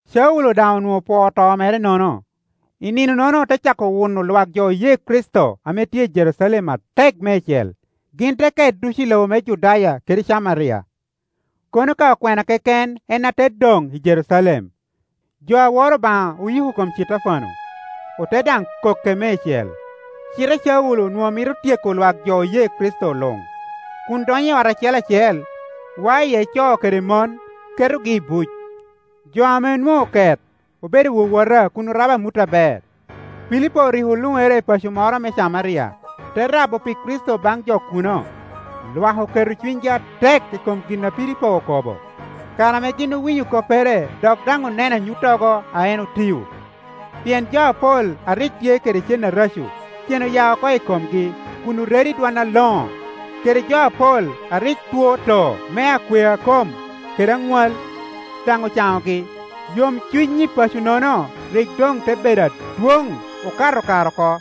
Caulo daŋ onwoŋo opwoo to mere-nono. Caulo owuno lwak jo oye Kricito I nino-nono ote cako wuno lwak jo oye Kricito ame tye i Jerucalem atek meicel; gin te ket ducu i lobo me Judaya kede Camaria, kono ka okwena keken en ate doŋ i Jerucalem. Jo a woro Obaŋa oyiko kom Citefano, ote daŋ koke meicel. Cite Caulo onwoŋo mito tyeko lwak jo oye Kricito luŋ, kun donyo i ot acel acel, wao iye co kede mon, ketogi i buc. Jo ame onwoŋo oket obedo wowota kun orabo amut aber. Pilipo rik oluŋere i paco moro me Camaria, te rabo pi Kricito baŋ jo kuno. Lwak oketo cunygi atek i kom gin a Pilipo okobo; kare ame gin owinyo koppere dok daŋ oneno anyuttogo a en otio. Pien jo apol a rik tye kede cen areco, cen oya oko i komgi kun oredo i dwon aloŋo; kede jo apol a rik two too me akwea kom kede aŋwal, daŋ ocaŋogi. Yomcuny i paco-nono rik doŋ te bedo adwoŋ okato kare oko.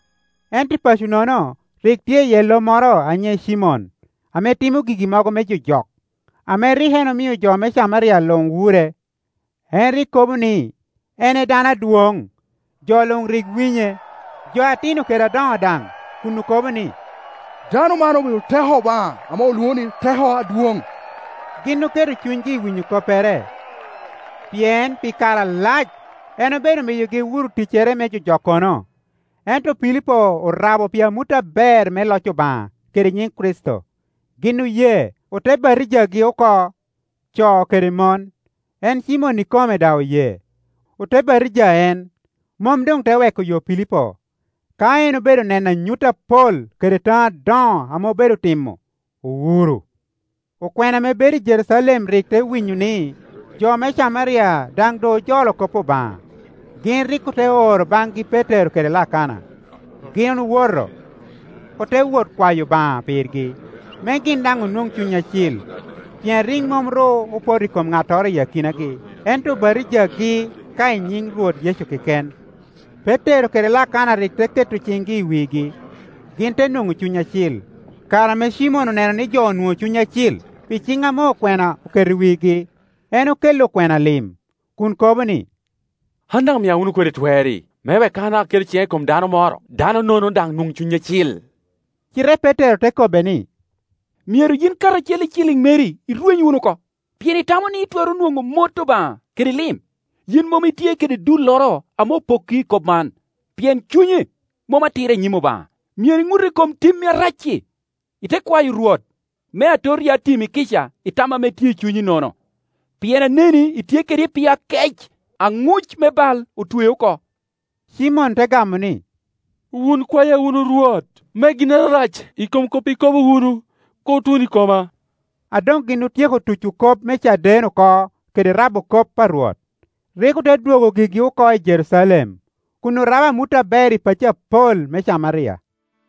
Ento i paco-nono rik tye iye lomoro a nyiŋe Cimon ame timo gigi mogo me jojok, ame rik en omio jo me Camaria luŋ wure; en rik kobo ni en e dano adwoŋ. Jo luŋ rik winye, jo ati no kede adoŋo daŋ, kun okobo ni, “Dano man obedo teko Obaŋa ame olwoŋo ni, Teko Adwoŋ.” Gin oketo cunygi i winyo koppere, pien pi kare alac en obedo miyogi wuro ticcere me jojokkono. Ento Pilipo orabo pi amut aber me loc Obaŋa kede nyiŋ Kricito, gin oye, ote batijagi oko, co kede mon. En Cimon ikome daŋ oye, ote batija en, mom doŋ te weko yo Pilipo; ka en obedo neno anyut apol kede taŋo adoŋo ame obedo timo, owuro. Okwena ame bedo i Jerucalem rik te winyo ni jo me Camaria daŋ doŋ ojolo kop Obaŋa; gin rik te oro baŋgi Petero kede Lakana. Gin owoto, ote wot kwayo Obaŋa pirgi, me gin daŋ onwoŋ Cuny Acil; pien rik mom ru opoto i kom ŋattoro i akinagi, ento obatijagi ka i nyiŋ Rwot Yecu keken. Petero kede Lakana rik te ke to ciŋgi i wigi, gin te nwoŋo Cuny Acil. Kare ame Cimon oneno ni jo onwoŋo Cuny Acil pi ciŋ ame okwena oketo i wigi, en okelli okwena lim, kun kobo ni, “An daŋ mia wunu kodi twer-ri, me wek ka an daŋ abino keto ciŋa i kom dano moro, dano-nono daŋ nwoŋ Cuny Acil.” Cite Petero te kobbe ni, “Myero yin karacel i ciliŋ meri irweny wunu oko, pien itamo ni itwero nwoŋo mot Obaŋa kede lim! Yin mom itye kede dulloro ame opokki i kop man, pien cunyi mom atira i nyim Obaŋa. Myero iŋut i kom timmi arac-ci, ite kwayo Rwot, me atot ya timmi kica i tam ame tye i cunyi-nono. Pien aneni itye kede epio akec, aŋuc me bal otwei oko.” Cimon te gamo ni, “Wun kwaya wunu Rwot, me ginnoro arac i kom kop ikobo wunu kur tun i koma,” A doŋgin otyeko tuco kop me caden oko kede rabo kop a Rwot, rik ote dwogo gigi oko i Jerucalem, kun orabo amut aber i pacci apol me Camaria.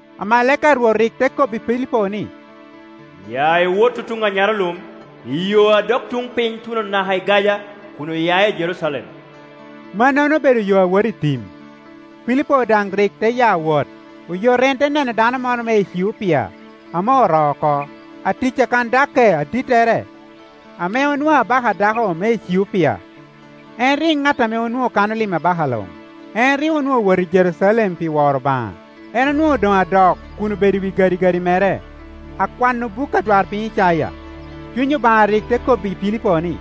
Amalaika a Rwot rik te kobbi Pilipo ni, “Ya iwot tutuŋ anyarolum i yo a dok tuŋ piny tuno naka i Gaja kun oya i Jerucalem.” (Mannono obedo yo a woto i tim) Pilipo daŋ rik te ya wot. Oyot en te neno dano moro me Eciopia ame oroo oko, atic a Kandake adittere, ame onwoŋo abaka a dako me Eciopia; en rik ŋat ame onwoŋo kano lim abaka luŋ. En rik onwoŋo owoto i Jerucalem pi woro Obaŋa. En onwoŋo doŋ adok kun obedo i wi gadigadi mere, akwano buk adwarpiny Icaya. Cuny Obaŋa rik te kobbi Pilipo ni,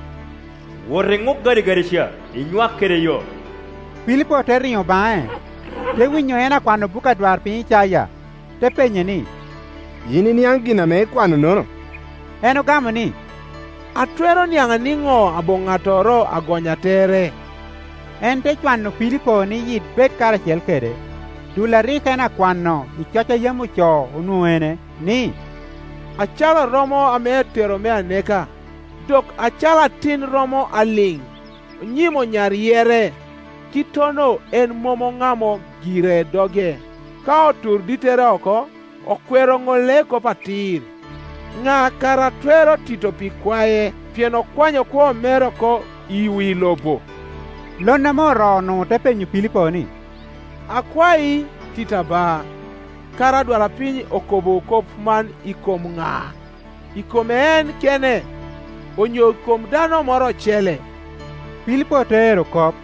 “Wot iŋuk gadigadi ca, inywak kede yo.” Pilipo te riŋo baŋe, te winyo en akwano buk adwarpiny Icaya, te penye ni, “Yin iniaŋ gin ame ikwano-nono?” En ogamo ni, “Atwero niaŋ niŋo aboŋo ŋattoro a gonnya tere?” En te cwano Pilipo ni yit bed karacel kede. Dul a rik en akwano i coc a yam ocoo onwoŋo ene, ni, “Acalo romo ame atero me aneka, dok acalo atin romo a liŋ i nyim onyar yerrere, kittono en mom oŋamo gire doge. Ka oturo dittere oko, okwero ŋolle kop atir. Ŋa kara a twero tito pi ikwae? Pien okwanyo kwo mere oko i wi lobo.” Lon ame oroo-nu te penyo Pilipo ni, “Akwai, titta ba, kara adwarpiny okobo kop man i kom ŋa? I kome en kene, onyo i kom dano moro ocele?” Pilipo te ero kop,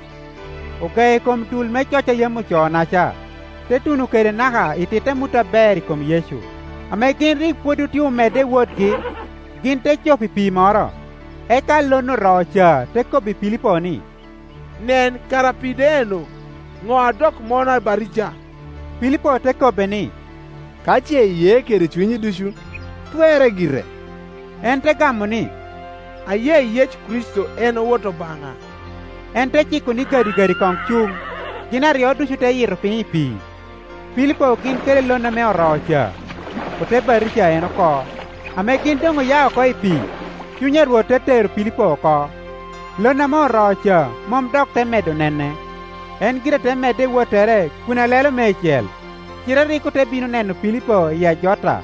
ogeo i kom dul me coc a yam ocoo-naca, te tuno kede naka ititte amut aber i kom Yecu. Ame gin rik pwod otye omedde i wotgi, gin te cop i pii moro, eka lon oroo ca te kobbi Pilipo ni, “Nen, kara pii do eŋeo! Ŋo a dok mona batija?” [ Pilipo te kobbe ni, “Ka ce iye kede cunyi ducu, twerre gire.” En te gamo ni, “Aye Yecu Kricito en Wot Obaŋa.”] En te ciko ni gadigadi koŋ cuŋ, gin aryo ducu te yitto piny i pii, Pilipo gin kede lon ame oroo ca, ote batija en oko. Ame gin doŋ oya oko i pii, Cuny a Rwot te tero Pilipo oko, lon ame oroo ca mom dok te medo nene; en gire te medde i wottere kun alelo meicel. Cite rik ote bino neno Pilipo i Ajota.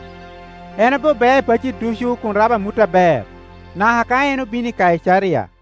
En obe bea i pacci ducu kun rabo amut aber, naka ka en obino i Kaicaria.